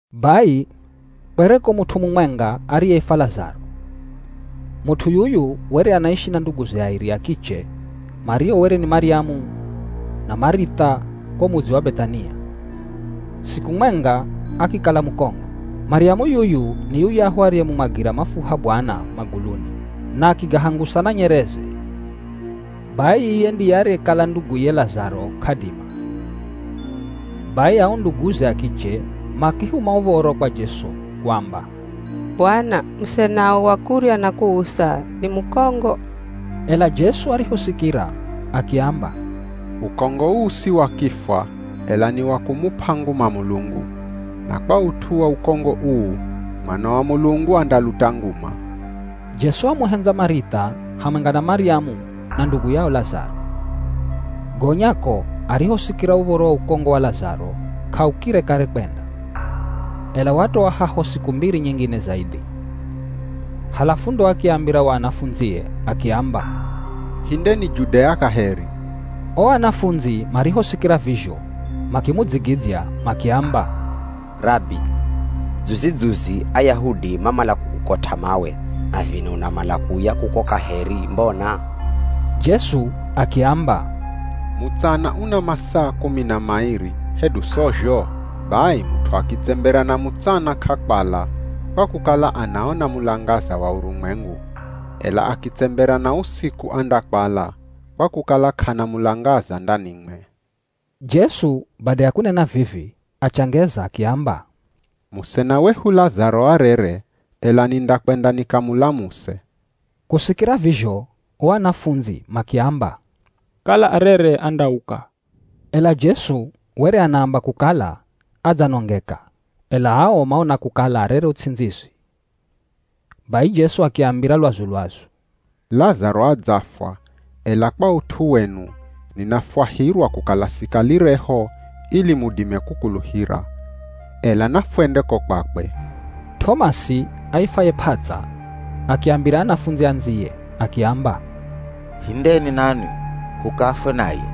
Bai kwereko mut'u mumwenga ariyeifwa Lazaro. Mut'u yuyu were anaishi na nduguze airi a kiche mario were ni Maryamu na Marith'a ko mudzi wa Beth'ania. Siku mwenga akikala mukongo. (Maryamu yuyu ni yuyahu ariyemumwagira mafuha Bwana maguluni na akigahangusa na nyereze. Bai iye ndiye ariyekala nduguye Lazaro k'adima.) Bai ao nduguze a kiche makihuma uv̱oro kwa Jesu kuamba, “Bwana musenao wa kurya na kuusa ni mukongo.” Ela Jesu arihosikira akiamba, “Ukongo uu si wa kifwa, ela ni wa kumup'a nguma Mulungu. Na kwa ut'u wa ukongo uu, Mwana wa Mulungu andaluta nguma.” Jesu wamuhendza Marith'a hamwenga na Maryamu na ndugu yao Lazaro. Gonya ko, arihosikira uv̱oro wa ukongo wa Lazaro k'aukire kare kwenda, ela watoa haho siku mbiri nyingine zaidhi. Halafu ndo akiambira o anafundzie akiamba, “Hindeni Judea kaheri.” O anafundzi marihosikira vizho makimudzigidzya makiamba, “Rabi, dzuzi-dzuzi Ayahudi mamala kukukot'a mawe, na vino unamala kuuya kuko kaheri mbona?” Jesu akiamba, “Mutsana una masaa kumi na mairi, hedu sozho? Bai mut'u akitsembera na mutsana k'akwala, kwa kukala anaona mulangaza wa urumwengu. Ela akitsembera na usiku andakwala, kwa kukala k'ana mulangaza ndanimwe.” Jesu bada ya kunena vivi, achangeza akiamba, “Musena wehu Lazaro arere, ela nindakwenda nikamulamuse.” Kusikira vizho o anafundzi makiamba, “Kala arere andauka.” Ela Jesu were anaamba kukala adzanongeka, ela ao maona kukala arere uts'indzizi. Bai Jesu akiambira lwazu-lwazu, “Lazaro adzafwa, ela kwa ut'u wenu ninafwahirwa kukala sikalireho ili mudime kukuluhira. Ela nafwende ko kwakwe.” T'omasi aifwaye “P'ats'a” akiambira anafundzi andziye akiamba, “Hindeni nanwi, hukafwe naye.”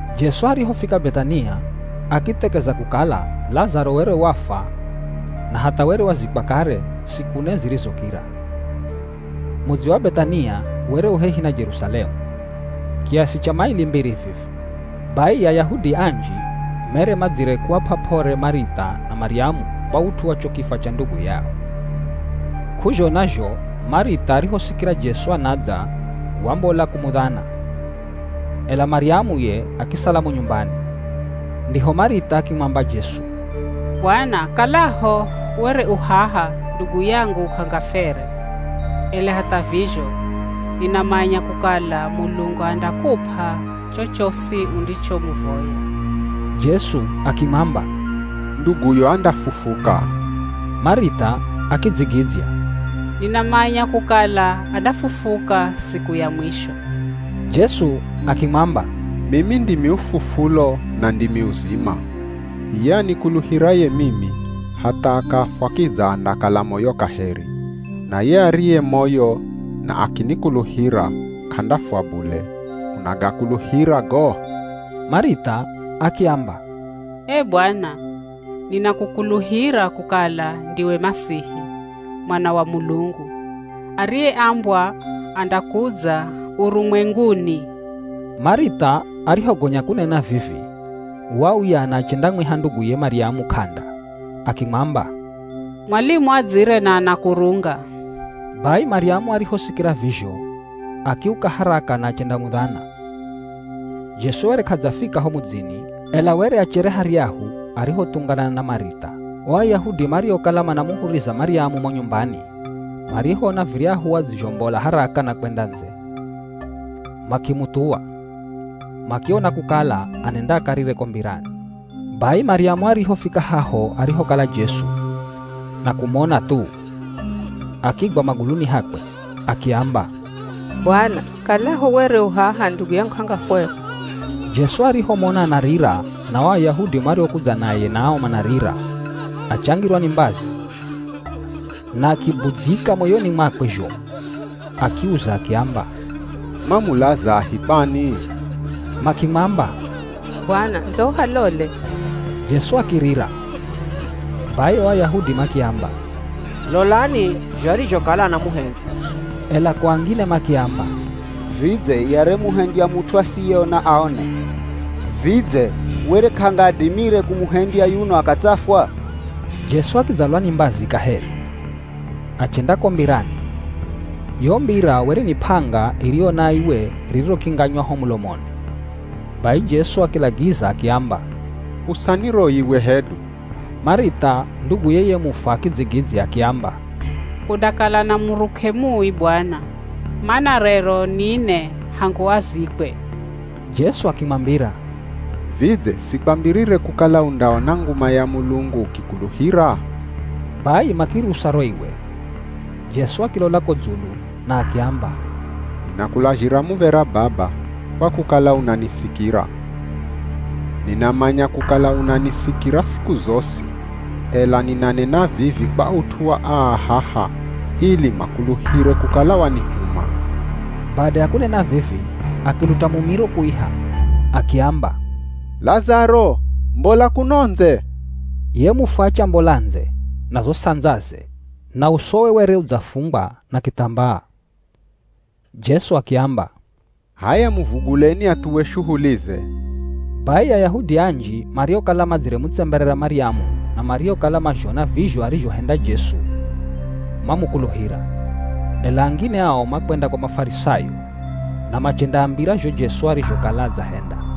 Jesu arihofika Beth'ania akithekeza kukala Lazaro were wafwa na hatha were wazikwa kare siku ne zirizokira. Mudzi wa Beth'ania were u hehi na Jerusalemu, kiasi cha maili mbiri vivi. Bai Ayahudi anji mere madzire kuap'a p'ore Marith'a na Maryamu kwa ut'u wa cho kifwa cha ndugu yao. K'uzhona zho Marith'a arihosikira Jesu anadza wambola kumudhana, ela Maryamu ye akisala mo nyumbani. Ndiho Marith'a akimwamba Jesu, “Bwana kalaho were u haha ndugu yangu k'angafwere, ela hatha vizho ninamanya kukala Mulungu andakup'a chochosi undichomuvoya.” Jesu akimwamba, “Nduguyo andafufuka.” Marith'a akidzigidzya, “Ninamanya kukala andafufuka siku ya mwisho.” Jesu akimwamba, “Mimi ndimi ufufulo na ndimi uzima. Iye anikuluhiraye mimi hatha akafwa kidza andakala moyo kaheri, na ye ariye moyo na akinikuluhira, k'andafwa bule. Unagakuluhira go?” Marith'a akiamba, “Ee Bwana, ninakukuluhira kukala ndiwe Masihi Mwana wa Mulungu ariyeambwa andakudza urumwenguni.” Marith'a arihogonya kunena vivi, wauya na achendamwiha nduguye Maryamu k'anda. Akimwamba, “Mwalimu adzire na anakurunga.” Bai Maryamu arihosikira vizho, akiuka haraka na achendamudhana. Jesu were k'adzafika ho mudzini, ela were achere haryahu arihothunganana na Marith'a. O Ayahudi mariokala manamuhuriza Maryamu mo nyumbani, marihoona viryahu adzizhombola haraka na kwenda ndze, makimuthuwa, makiona kukala anenda akarire ko mbirani. Bai Maryamu arihofika haho arihokala Jesu, na kumona thu, akigwa maguluni hakwe. Akiamba, “Bwana, kalaho were u haha ndugu yangu k'angafwere.” Jesu arihomona anarira na o Ayahudi mariokudza naye nao manarira, achangirwa ni mbazi na akibudzyika moyoni mwakwe zhomu. Akiuza akiamba, “Mwamulazahi kwani?” Makimwamba, “Bwana, ndzo uhalole!” Jesu akirira. Bai o Ayahudi makiamba, “Lolani zho arizhokala anamuhendza.” Ela ko angine makiamba, “Vidze ye ariyemuhendya mut'u asiyeona aone, vidze were k'angadimire kumuhendya yuno akatsafwa?” Jesu akidzalwa ni mbazi kaheri, achenda ko mbirani. Yo mbira were ni p'anga iriyo na iwe ririrokinganywa ho mulomoni. Bai Jesu akilagiza akiamba, “Usani ro iwe hedu.” Marith'a nduguye ye mufwa akidzigidzya akiamba, “Kundakala na muruk'e mui Bwana, mana rero ni ne hangu azikwe.” Jesu akimwambira, “Vidze sikwambirire kukala undaona nguma ya Mulungu ukikuluhira?” Bai makirusa ro iwe. Jesu akilola ko dzulu na akiamba, “Ninakulazhira muv̱era Baba, kwa kukala unanisikira. Ninamanya kukala unanisikira siku zosi, ela ninanena vivi kwa ut'u wa aa haha ili makuluhire kukala wanihuma.” Bada ya kunena vivi akiluta mumiro kuiha. Akiamba, “Lazaro mbola kuno ndze!” Ye mufwa achambola ndze na zo sandzaze na usowe were udzafungwa na kithambaa. Jesu akiamba, “H'aya muvuguleni athuwe shuhulize.” Bai Ayahudi anji mariokala madziremutsemberera Maryamu na mariokala mazhona vizho arizhohenda Jesu mamukuluhira. Ela angine ao makwenda kwa Mafarisayo na machendaambira zho Jesu arizhokala adzahenda.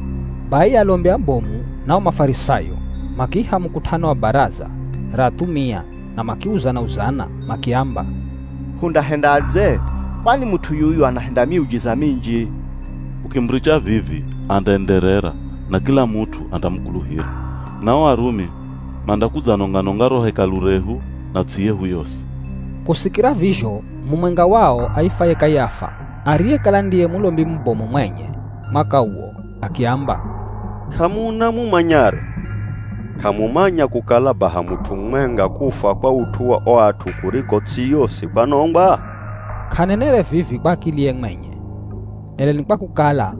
Bai alombi abomu na o Mafarisayo makiiha mukut'ano wa Baraza ra athumia na makiuzana-uzana makiamba, “Hundahendadze? Kwani mut'u yuyu anahenda miujiza minji. Hukimuricha vivi andaenderera na kila mut'u andamukuluhira, na o Arumi mandakudzanonga-nonga ro Hekalu rehu na ts'i yehu yosi.” Kusikira vizho mumwenga wao aifwaye Kayafa ariyekala ndiye Mulombi mubomu mwenye mwaka uwo akiamba, “K'amuna mumanyaro. K'amumanya kukala baha mut'u mumwenga kufwa kwa ut'u wa o at'u kuriko ts'i yosi kwanongwa?” K'anenere vivi kwa akiliye mwenye, ela ni kwa kukala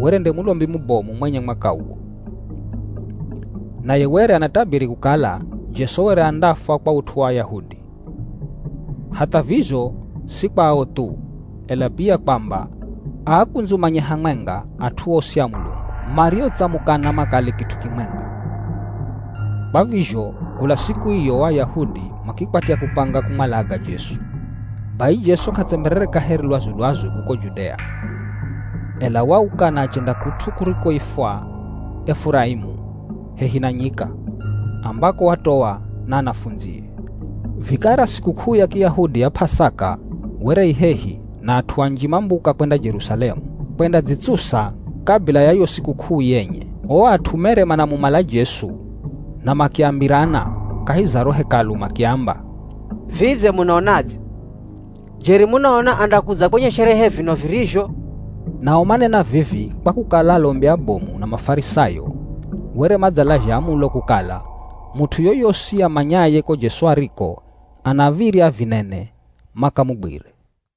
were nde Mulombi mubomu mwenye mwaka uwo, naye were anatabiri kukala Jesu were andafwa kwa ut'u wa Ayahudi. Hatha vizho si kwa ao thu, ela pia kwamba aakundzumanye hamwenga at'u osi a Mulungu mariotsamukana makale kit'u kimwenga. Kwa vizho kula siku iyo o Ayahudi makikwatya kupanga kumwalaga Jesu. Bai Jesu k'atsemberere kaheri lwazu-lwazu kuko Judea, ela wauka na achenda kut'u kurikoifwa Efuraimu hehi na nyika, ambako watoa na anafundzie. Vikara sikuk'uu ya Kiyahudi ya P'asaka were i hehi na at'u anji mambuka kwenda Jerusalemu, kwendadzitsusa kabila ya yo sikuk'uu yenye. O at'u mere manamumala Jesu na makiambirana kahi za ro Hekalu makiamba, “Vidze munaonadze? Jeri munaona andakudza kwenye sherehe vino virizho?” Nao manena vivi kwa kukala alombi abomu na Mafarisayo were madzalazha amulo kukala mut'u yoyosi amanyaye ko Jesu ariko anav̱irya avinene makamugwire.